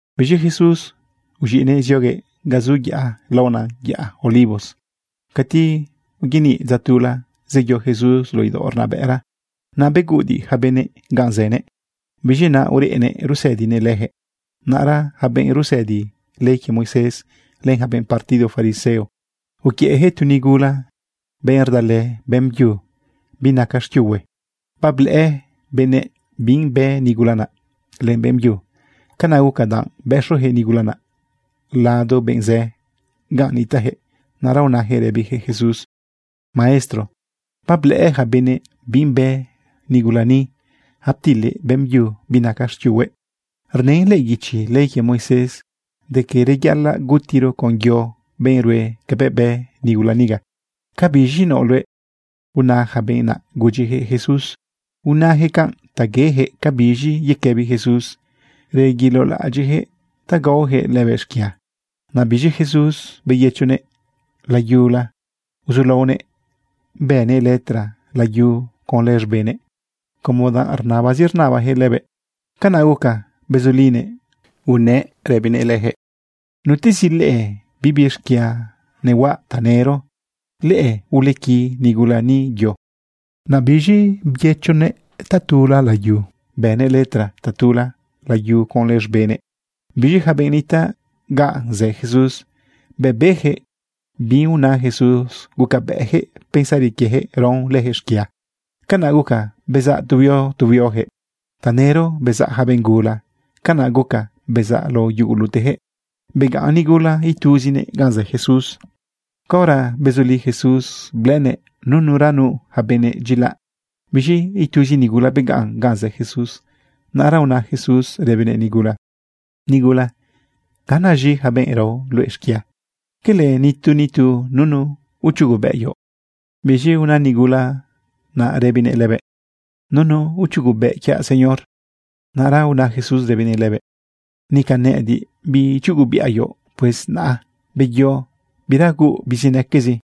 Biz̃i Jesús uz̃iꞌnëꞌ zioguëꞌ ga zu yaꞌa laona yaꞌa Olivos. Cati uyaniꞌ dza tula, zeyo Jesús luꞌu idaoꞌ rnabëꞌra. Naꞌ beguꞌudiꞌ yaca benëꞌ ganꞌ zënëꞌ. Biz̃i naꞌ ureꞌnëꞌ rusëdinëꞌ leyaquëꞌ. Naꞌra yaca benꞌ rusëdi ley quie Moisés len yaca benꞌ partido fariseo, uquiëꞌyaquëꞌ tu nigula, benꞌ rdalë beꞌmbyu binaca xquiuhue. Bablëꞌë benëꞌ binꞌ bë nigula naꞌ len beꞌmbyu. Canaꞌ guca danꞌ bëxoyaquëꞌ nigula naꞌ lado benꞌ zë ganꞌ nitaꞌyaquëꞌ. Naꞌra unayaquëꞌ rëbiyaquëꞌ Jesús: ―Maestro, bablëꞌë yaca benëꞌ binꞌ bë nigula ni, aptilëꞌ beꞌmbyu binaca xquiuhuëꞌ. Rnën lëꞌë guichi ley quie Moisés de quie reyaꞌalaꞌ gutiro con yo benꞌ rue cabëꞌ bë nigula niga. ¿Cabiz̃i naoꞌ luëꞌ? ―una yaca benꞌ naꞌ gudyijëꞌ Jesús. Unayaquëꞌ canꞌ ta yeyaquëꞌ cabiz̃i yequëbi Jesús. Reguilolaꞌadyiꞌyaquëꞌ ta gaoyaquëꞌ lëbëꞌ xquia. Naꞌ biz̃i Jesús byëchonëꞌ layula uzulaonëꞌ bënëꞌ letra layu conlë z̃benëꞌ. Como danꞌ rnabazi rnabayaquëꞌ lëbëꞌ, canaꞌ guca bezulinëꞌ unëꞌ rëbinëꞌ leyaquëꞌ: ―Nutezi leꞌe bibi xquia nehuaꞌ, tanëro leꞌe ulequi nigula ni yo. Naꞌ biz̃i beyëchonëꞌ tatula layu. Bënëꞌ letra tatula layu conlë z̃benëꞌ. Biz̃i yaca benꞌ nitaꞌ ga zë Jesús, bëꞌ beyaquëꞌ bi una Jesús, gucabëꞌyaquëꞌ pensari quieyaquëꞌ raon leyaquëꞌ xquia. Canaꞌ guca bezaꞌ tu huio tu huioyaquëꞌ. Tanëro bezaꞌ yaca benꞌ gula, canaꞌ guca bezaꞌ lao yuguluteyaquëꞌ. Begaꞌn nigula ituzinëꞌ ganꞌ zë Jesús. Caora bezuli Jesús, blëꞌënëꞌ nuranu yaca benëꞌ dyilaꞌ. Biz̃i ituzi nigula begaꞌn ganꞌ zë Jesús. Naꞌra una Jesús rëbinëꞌ nigula: ―Nigula, ¿ganaz̃i yaca benꞌ rao luëꞌ xquia? ¿Quele nitu nitu nunu ichugobëꞌ quioꞌ? Biz̃i una nigula naꞌ rëbinëꞌ lëbëꞌ: ―Nunu ichugobëꞌ quiaꞌ, Señor. Naꞌra una Jesús rëbinëꞌ lëbëꞌ: ―Nica nëꞌëdiꞌ biichugobiꞌa quioꞌ. Pues naꞌ beyo, bira huuꞌ bizinaquezi.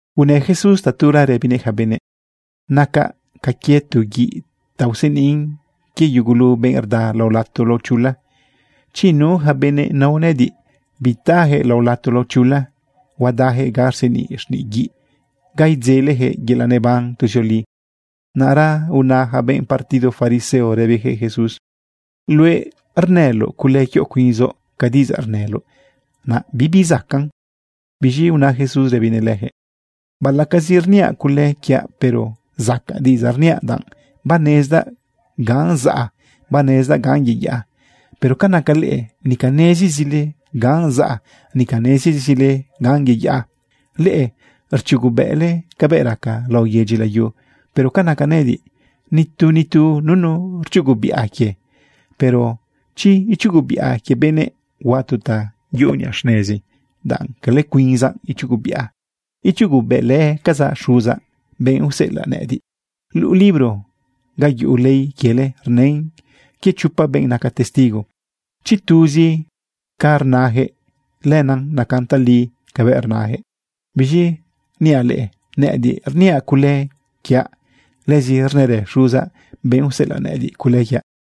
Unë Jesús tatula rëbinëꞌ yaca benëꞌ: ―Nacaꞌ ca quie tu guiꞌ ta useniꞌn quie yugulu benꞌ rda lao lato lao chula. Chi nu yaca benëꞌ nao nëꞌëdiꞌ, bitayaquëꞌ lao lato lao chula. Huadayaquëꞌ ga rseniꞌ xniꞌ guiꞌ, ga idzeleyaquëꞌ yelaꞌ neban tuzioli. Naꞌra una yaca benꞌ partido fariseo rëbiyaquëꞌ Jesús: ―Luëꞌ rnëloꞌ cule quioꞌ cuinzoꞌ. Ca diꞌidzaꞌ rnëloꞌ naꞌ bibizacaꞌn. Biz̃i una Jesús rëbinëꞌ leyaquëꞌ: ―Baꞌalaꞌcazi rniaꞌ cule quiaꞌ, pero zacaꞌ diꞌidzaꞌ rniaꞌ, danꞌ banezdaꞌ ganꞌ zaꞌa, banezdaꞌ ganꞌ yeyaꞌa. Pero ca naca leꞌe, nica nezizile ganꞌ zaꞌa, nica nezizile ganꞌ yeyaꞌa. Leꞌe rchugobëꞌle cabëꞌ raca lao yedyi layu. Pero ca naca nëꞌëdiꞌ, nitu nitu nunu rchugobiꞌa quie. Pero chi ichugobiꞌa quie benëꞌ, huaꞌ tu ta yuꞌu niꞌa xnezi danꞌ cala cuinzaꞌ ichugobiꞌa, ichugobëꞌlëcazaꞌ Xuzaꞌ, benꞌ useꞌelaꞌ nëꞌëdiꞌ. Luꞌu libro ga yuꞌu ley quiele, rnën quie chopa benꞌ naca testigo. Chi tuzi ca rnayaquëꞌ, lenaꞌ nacan tali cabëꞌ rnëyaquëꞌ. Biz̃i niaꞌ leꞌe, nëꞌëdiꞌ rniaꞌ cule quiaꞌ, lëzi rnërë Xuzaꞌ, benꞌ useꞌelaꞌ nëꞌëdiꞌ, cule quiaꞌ.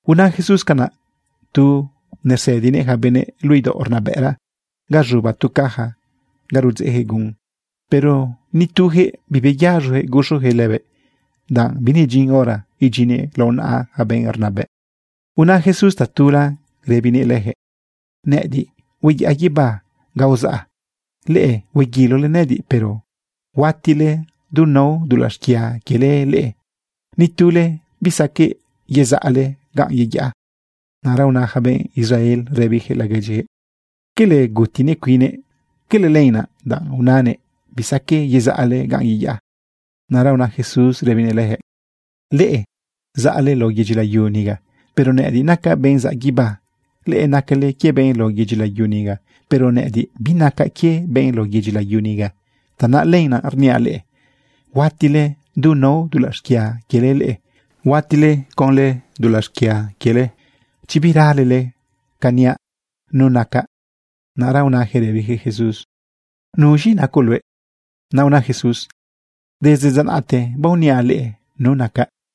Una Jesús canaꞌ tu nersëdinëꞌ yaca benëꞌ luꞌu idaoꞌ rnabëꞌra ga z̃uba tu caja ga rudzeꞌyaquëꞌ gun. Pero nituyaquëꞌ bibeyaz̃oyaquëꞌ guxoyaquëꞌ lëbëꞌ, danꞌ binedyin hora idyinnëꞌ lao naꞌa yaca benꞌ rnabëꞌ. Una Jesús tatula rëbinëꞌ leyaquëꞌ: ―Nëꞌëdiꞌ hueyaꞌa guibá ga uzaꞌa. Leꞌe hueguilole nëꞌëdiꞌ, pero huatile du nao dulaꞌ xquia quiele leꞌe. Nitule bisaqueꞌ yezaꞌle ganꞌ yeyaꞌa. Naꞌra una yaca benꞌ Israel rëbiyaquëꞌ laguedyiyaquëꞌ: ―¿Cala gutinëꞌ cuinnëꞌ? ¿Cala lenaꞌ danꞌ unanëꞌ: “Bisaqueꞌ yezaꞌle ganꞌ yeyaꞌa”? Naꞌra una Jesús rëbinëꞌ leyaquëꞌ: ―Leꞌe zaꞌle lao yedyi layu niga, pero nëꞌëdiꞌ nacaꞌ benꞌ zaꞌ guibá. Leꞌe nacale quie benꞌ lao yedyi layu niga, pero nëꞌëdiꞌ binacaꞌ quie benꞌ lao yedyi layu niga. Tanaꞌ lenaꞌ rniaꞌ leꞌe, huatile du nao dulaꞌ xquia quiele leꞌe. Huatile conlë dulaꞌ xquia quiele chi biralele ca niaꞌ nu nacaꞌ. Naꞌra unayaquëꞌ rëbiyaquëꞌ Jesús: ―¿Nuz̃i nacoꞌ luëꞌ? Naꞌ una Jesús: ―Desde dza naꞌte, baoniaꞌ leꞌe nu nacaꞌ.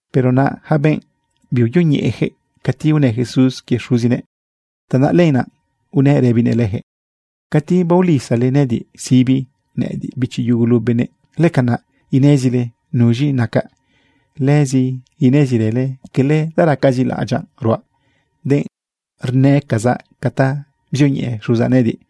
Pero naꞌ yaca benꞌ biuyoñeꞌeyaquëꞌ cati unë Jesús quie Xuzinëꞌ. Tanaꞌ lenaꞌ unëꞌ rëbinëꞌ leyaquëꞌ: ―Cati baolisale nëꞌëdiꞌ sibi, nëꞌëdiꞌ bichi yugulu benëꞌ, lëcanaꞌ inezile nuz̃i nacaꞌ. Lëzi inezirële cala ta racazi laꞌadyaꞌ ruaꞌ, denꞌ rnëcazaꞌ ca ta bzioñeꞌe Xuzaꞌ nëꞌëdiꞌ.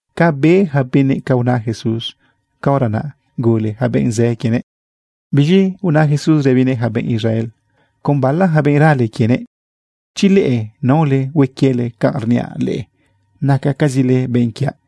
Ca be yaca benëꞌ ca una Jesús, caora naꞌ gule yaca benꞌ zë quienëꞌ. Biz̃i una Jesús rëbinëꞌ yaca benꞌ Israel con bala yaca benꞌ rale quienëꞌ: ―Chi leꞌe naole hue quiele canꞌ rniaꞌ leꞌe, nacacazile benꞌ quiaꞌ.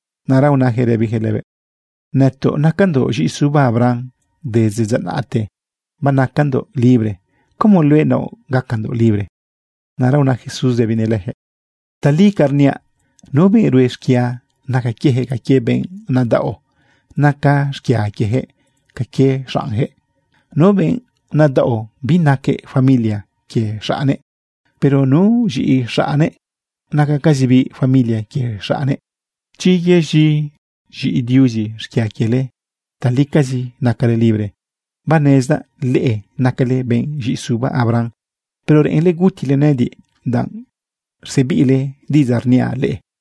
Naꞌra unayaquëꞌ rëbiyaquëꞌ lëbëꞌ: ―Nëtoꞌ nacandoꞌ z̃iꞌisuba Abraham. Desde dza naꞌte banacandoꞌ libre. ¿Cómo luëꞌ naoꞌ gacandoꞌ libre? Naꞌra una Jesús rëbinëꞌ leyaquëꞌ: ―Tali ca rniaꞌ, nu benꞌ rue xquia, naca quieyaquëꞌ ca quie benꞌ nadaꞌo. Naca xquia quieyaquëꞌ ca quie xaꞌnyaquëꞌ. Nu benꞌ nadaꞌo, binaquëꞌ familia quie xaꞌnnëꞌ. Pero nu z̃iꞌi xaꞌnnëꞌ, nacacazibiꞌ familia quie xaꞌne. Chi yez̃i z̃iꞌi Diuzi xquia quiele, talicazi nacale libre. Banezdaꞌ leꞌe nacale benꞌ z̃iꞌisuba Abraham, pero reꞌenle gutile nëꞌëdiꞌ, danꞌ rsebiꞌle diꞌidzaꞌ rniaꞌ leꞌe.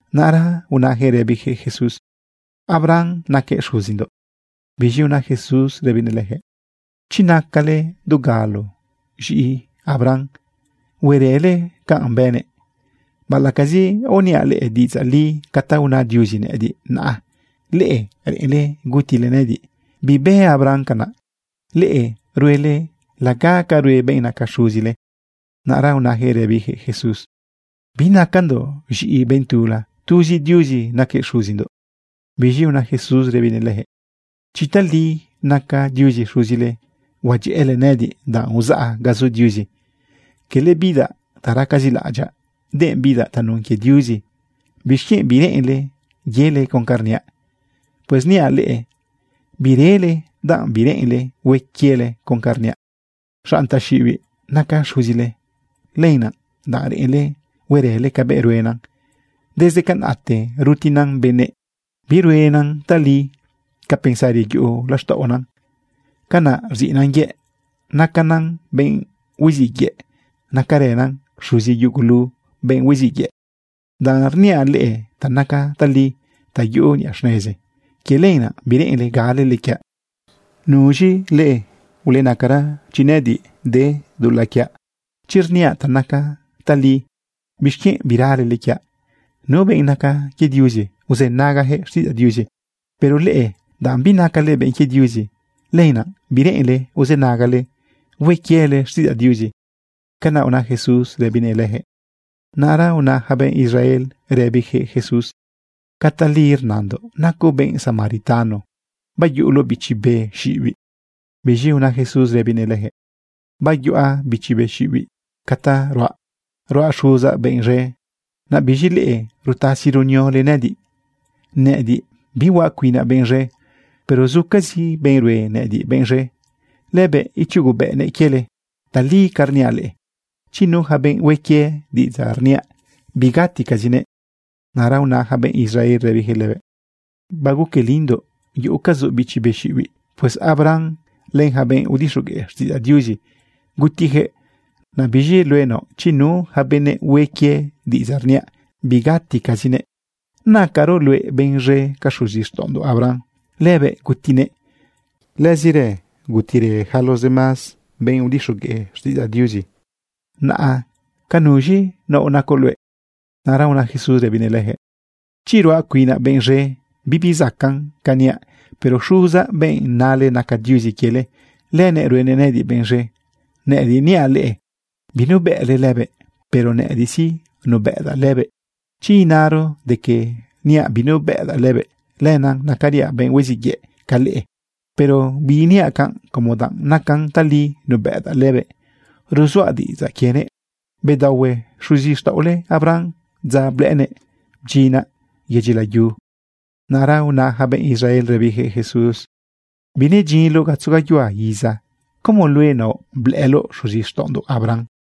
Naꞌra unayaquëꞌ rëbiyaquëꞌ Jesús: ―Abraham naquëꞌ xuzindoꞌ. Biz̃i una Jesús rëbinëꞌ leyaquëꞌ: ―Chi nacale dugalo z̃iꞌi Abraham, huerële canꞌ bënëꞌ. Baꞌalaꞌcazi aoniaꞌ leꞌe diꞌidzaꞌ li ca ta una Diuzi nëꞌëdiꞌ, naꞌ leꞌe reꞌenle gutile nëꞌëdiꞌ. Bibë Abraham canaꞌ. Leꞌe ruele laga ca rue benꞌ naca xuzile. Naꞌra unayaquëꞌ rëbiyaquëꞌ Jesús: ―Binacandoꞌ z̃iꞌi benꞌ tula. Tuzi Diuzi naquëꞌ xuzindoꞌ. Biz̃i una Jesús rëbinëꞌ leyaquëꞌ: ―Chi tali naca Diuzi xuzile, huadyëꞌële nëꞌëdiꞌ danꞌ uzaꞌ ga zu Diuzi. Cala bidaꞌ ta racazi laꞌadyaꞌ, denꞌ bidaꞌ tanun quie Diuzi. ¿Bixquienꞌ bireꞌenle yele con ca rniaꞌ? Pues niaꞌ leꞌe, birele danꞌ bireꞌenle hue quiele con ca rniaꞌ. Xanꞌ taxiꞌibiꞌ naca xuzile. Lenaꞌ danꞌ reꞌenle huerële cabëꞌ ruenan. Desde canaꞌte rutinan benëꞌ, biruenan tali. Ca pensari yuꞌu laxtaꞌonan, canaꞌ rziꞌnan yëꞌ. Nacanan benꞌ huiziꞌ yëꞌ. Nacarënan xuzi yugulu benꞌ huiziꞌ yëꞌ. Danꞌ rniaꞌ leꞌe ta naca tali, ta yuꞌu niꞌa xnezi, quie lenaꞌ bireꞌenle galele quiaꞌ. ¿Nuz̃i leꞌe ulenacara chi nëꞌëdiꞌ de dulaꞌ quiaꞌ? Chi rniaꞌ ta naca tali, ¿bixquienꞌ biralele quiaꞌ? Nu benꞌ naca quie Diuzi, uzënagayaquëꞌ xtiꞌidzaꞌ Diuzi. Pero leꞌe, danꞌ binacale benꞌ quie Diuzi, lenaꞌ bireꞌenle uzënagale hue quiele xtiꞌidzaꞌ Diuzi. ―Canaꞌ una Jesús rëbinëꞌ leyaquëꞌ. Naꞌra una yaca benꞌ Israel rëbiyaquëꞌ Jesús: ―¿Cala tali rnandoꞌ nacoꞌ benꞌ samaritano bayuꞌuloꞌ bichi be xiꞌibiꞌ? Biz̃i una Jesús rëbinëꞌ leyaquëꞌ: ―Biyuꞌa bichi be xiꞌibiꞌ. Ca ta ruaꞌ, ruaꞌ Xuzaꞌ benꞌ z̃e. Naꞌ biz̃i leꞌe, rutasi runiole nëꞌëdiꞌ. Nëꞌëdiꞌ bihuaꞌ cuinaꞌ benꞌ z̃e, pero zucazi benꞌ rue nëꞌëdiꞌ benꞌ z̃e. Lëbëꞌ ichugobëꞌnëꞌ quiele. Tali ca rniaꞌ leꞌe, chi nu yaca benꞌ hue quie diꞌidzaꞌ rniaꞌ, bigaticazinëꞌ. Naꞌra una yaca benꞌ Israel rëbiyaquëꞌ lëbëꞌ: ―Baguquelindoꞌ yuꞌucazoꞌ bichi be xiꞌibiꞌ. Pues Abraham len yaca benꞌ udixogueꞌ xtiꞌidzaꞌ Diuzi, gutiyaquëꞌ. Naꞌ biz̃i luëꞌ naoꞌ: “Chi nu yaca benëꞌ hue quie diꞌidzaꞌ rniaꞌ, bigaticazinëꞌ.” ¿Nacaroꞌ luëꞌ benꞌ z̃e ca xuzixtaꞌondoꞌ Abraham? Lëbëꞌ gutinëꞌ, lëzirë gutirë yaca los demás benꞌ udixogueꞌ xtiꞌidzaꞌ Diuzi, naꞌa ¿ca nuz̃i naoꞌ nacoꞌ luëꞌ? Naꞌra una Jesús rëbinëꞌ leyaquëꞌ: ―Chi ruaꞌ cuinaꞌ benꞌ z̃e, bibi zacaꞌn ca niaꞌ. Pero Xuzaꞌ, benꞌ nale naca Diuzi quiele, lënëꞌ ruenëꞌ nëꞌëdiꞌ benꞌ z̃e. Nëꞌëdiꞌ niaꞌ leꞌe binubëꞌle lëbëꞌ, pero nëꞌëdiꞌ sí, nubëꞌdaꞌ lëbëꞌ. Chi inaro de que niaꞌ binubëꞌdaꞌ lëbëꞌ, lenaꞌ nacariaꞌ benꞌ huiziꞌ yëꞌ ca leꞌe. Pero biiniaꞌ canꞌ, como danꞌ nacan tali nubëꞌdaꞌ lëbëꞌ, ruzuaꞌ diꞌidzaꞌ quienëꞌ. Bedaohue xuzixtaꞌole Abraham dza blëꞌënëꞌ bdyinaꞌ yedyi layu. Naꞌra una yaca benꞌ Israel rëbiyaquëꞌ Jesús: ―Binedyinloꞌ gatzo gayuhua iza, ¿cómo luëꞌ naoꞌ blëꞌëloꞌ xuzixtaꞌondoꞌ Abraham?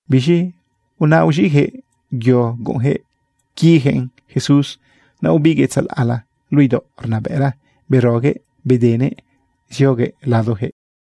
Biz̃i naꞌ uz̃iꞌyaquëꞌ yo guꞌunyaquëꞌ quiyaquëꞌn Jesús. Naꞌ ubiguëꞌ tzalaꞌla luꞌu idaoꞌ rnabëꞌra beroguëꞌ bedenëꞌ zioguëꞌ ladoyaquëꞌ.